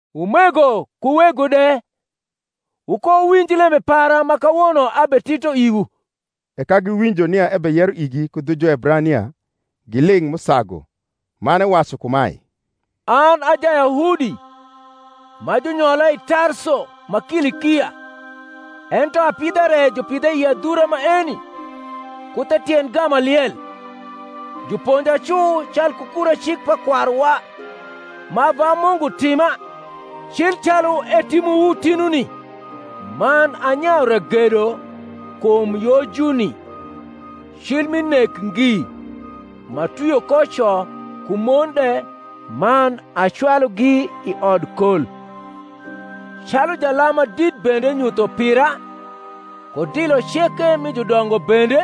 Umego ku wego de, wukowuwinj lembe para ma kawono abetito iwu. E ka giwinjo nia ebeyero igi ku dhu Juebrania, giling’ m’usagu: man ewacu kumae, An a Jayahudi, ma junyola i Tarso ma Kilikia, ento apidha re jupidha i adhura maeni, ku the tiend Gamaliel, juponja cu calku kura cik pa kwaruwa, ma ava Mungu tima, cil calu etimowu tinuni: man anyayu ragedo kum Yojuni cil mi nek ngi, m’atwio ko co ku mon de man acwalugi i odkol. Calu jalam ma dit bende nyutho pira, ku dilo ceke mi judongo bende: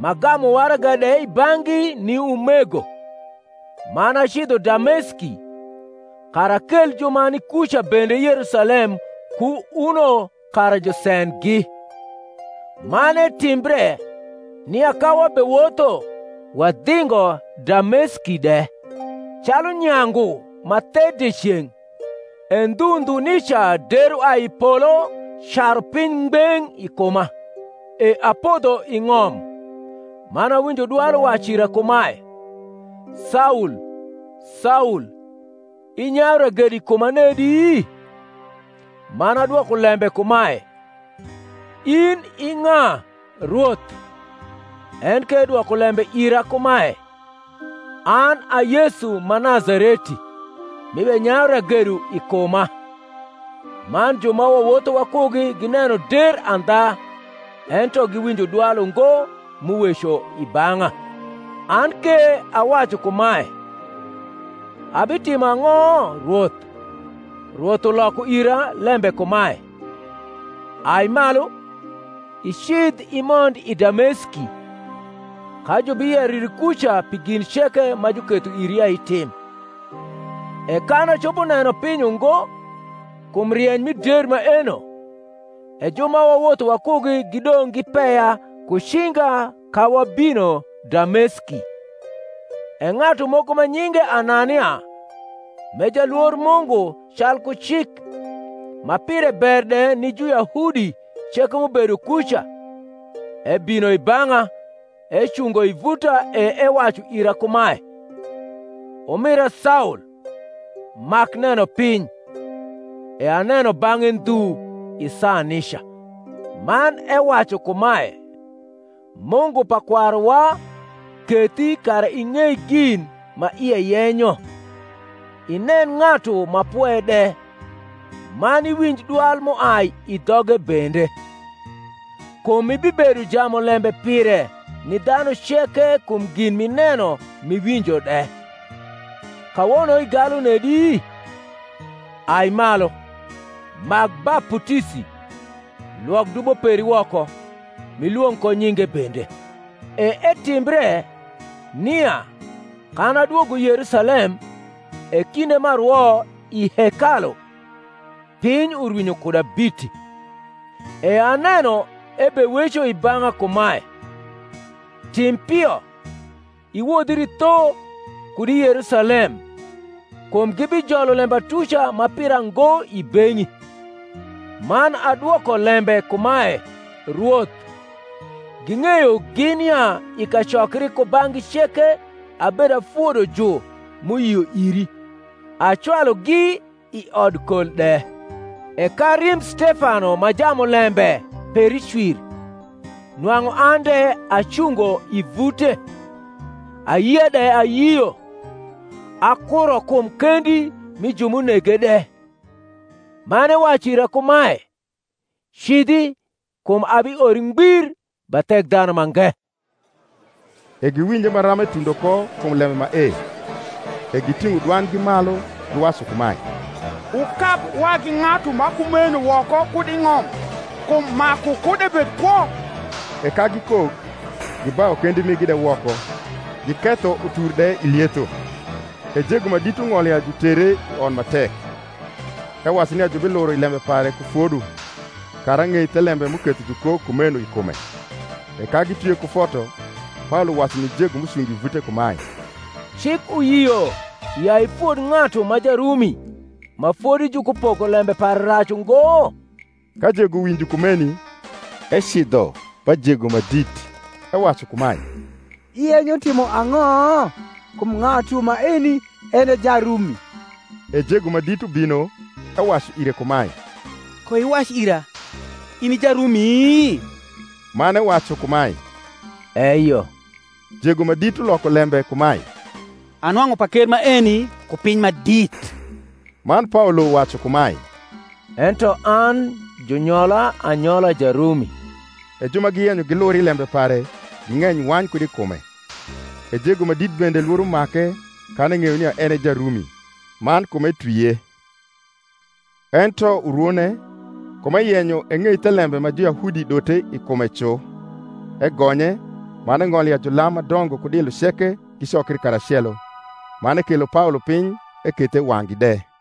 m’agamu waraga de i bang’gi ni umego, man acidho Dameski, kara akel ju ma ni kuca bende Yerusalem ku uno kara jusendgi. Man etimbre, nia ka wabewotho, wadhingo Dameski de, calu nyangu ma the dieceng’, e ndhu ndhu nica der uai i polo caru piny ngbeng’ i kuma. E apodho i ng’om, man awinjo dwal uwacu ira kumae, Saul, Saul, inyayu ragedo i kuma nedi? Man adwoko lembe kumae, In i ng’a, Rwoth? En ke edwoko lembe ira kumae, An a Yesu ma Nazareti, m’ibenyayu ragedo i kuma. Man ju ma wawotho wakugi gineno der andha, ento giwinjo dwal ungo m’uweco i bang’a. An ke awacu kumae, Abitimo ang’o, Rwoth? Rwoth uloko ira lembe kumae, Ai malu, icidh imond i Dameski; ka jubiyero iri kuca pi gin ceke ma juketho iri ya itim. E kan acopo neno piny ungo kum rieny mi der maeno, e ju ma wawotho wakugi gidong’ gipeya ku cinga ka wabino Dameski. E ng’atu moko ma nyinge Anania, m’e jalwor Mungu calku cik, ma pire ber de ni Juyahudi ceke m’ubedo kuca, ebino i bang’a, ecungo i vuta e ewacu ira kumae, Umira Saul, mak neno piny. E aneno bang’e ndhu i saa nica. Man ewacu kumae, Mungu pa kwaruwa kethi kara ing’ei gin ma ie yenyo, inen Ng’atu ma Pwe de, man iwinj dwal m’uai i dhoge bende. Kum ibibedo jamulembe pire ni dhanu ceke kum gin m’ineno m’iwinjo de. Kawono igalu nedi? ai malu, mak baputisi, lwok dubo peri woko, m’ilwong’ ko nyinge bende. E etimbre, nia, kan adwogo Yerusalem, e kinde m’arwo i hekalu, piny urwinyo kuda biti, e aneno ebeweco i bang’a kumae, Tim pio, iwodhri tho kud i Yerusalem kum gibijolo lembatuca ma pira ngo i beng’i. Man adwoko lembe kumae, Rwoth, ging’eyo gin ya i kacokri kubang’gi ceke abedafodo ju m’uyio iri acwalugi i odkol de: e ka rimb Stefano ma jamulembe peri cwir, nwang’u an de acungo i vute, ayia de ayio, akuro kum kendi mi ju m’unege de. Man ewacu ira kumae, Cidhi: kum abiori ngbir ba Thekdhanumange. E giwinje maram etundo ko kum lembe mae; e giting’o dwandgi malu, giwacu kumae, Wukab wagi ng’atu ma kumeno woko kud i ng’om: kum maku kud ebed kwo. E ka gikok, gibayu kendi migi de woko, giketho utur de i lietho, e jego ma dit ung’olo ya jutere i ot ma tek, ewacu nia jubiluro i lembe pare ku fodo, kara eng’ei thelembe m’uketho jukok kumeno i kume. E ka gitwie ku foto, Paolo wacu ni jego m’ucungo i vute kumae, Cik uyio ya ifod ng’atu ma Jarumi, ma fodi jukupoko lembe pare rac ungo? Ka jego winjo kumeni, ecidho ba jego ma dit, ewacu kumae, Iyenyo timo ang’o? kum ng’atu maeni en e Jarumi. E jego ma dit ubino ewacu ire kumae, Koiwac ira, in i Jarumi? Man ewacu kumae, Eyo. Jego ma dit uloko lembe kumae, Anwang’u paker maeni ku piny ma dit. Man Paolo wacu kumae, Ento an junyola anyola Jarumi. E ju ma giyenyo gliur i lembe pare ging’eny wany kud i kume: e jego ma dit bende lworo make kan eng’eyo nia en e Jarumi, man kum etwie. Ento urwone, kum eyenyo eng’ei thelembe ma Juyahudi dote i kume cu, egonye, man eng’olo ya julam ma dongo ku dilo ceke gicokri karacelo, man ekelo Paolo piny ekethe i wang’gi de.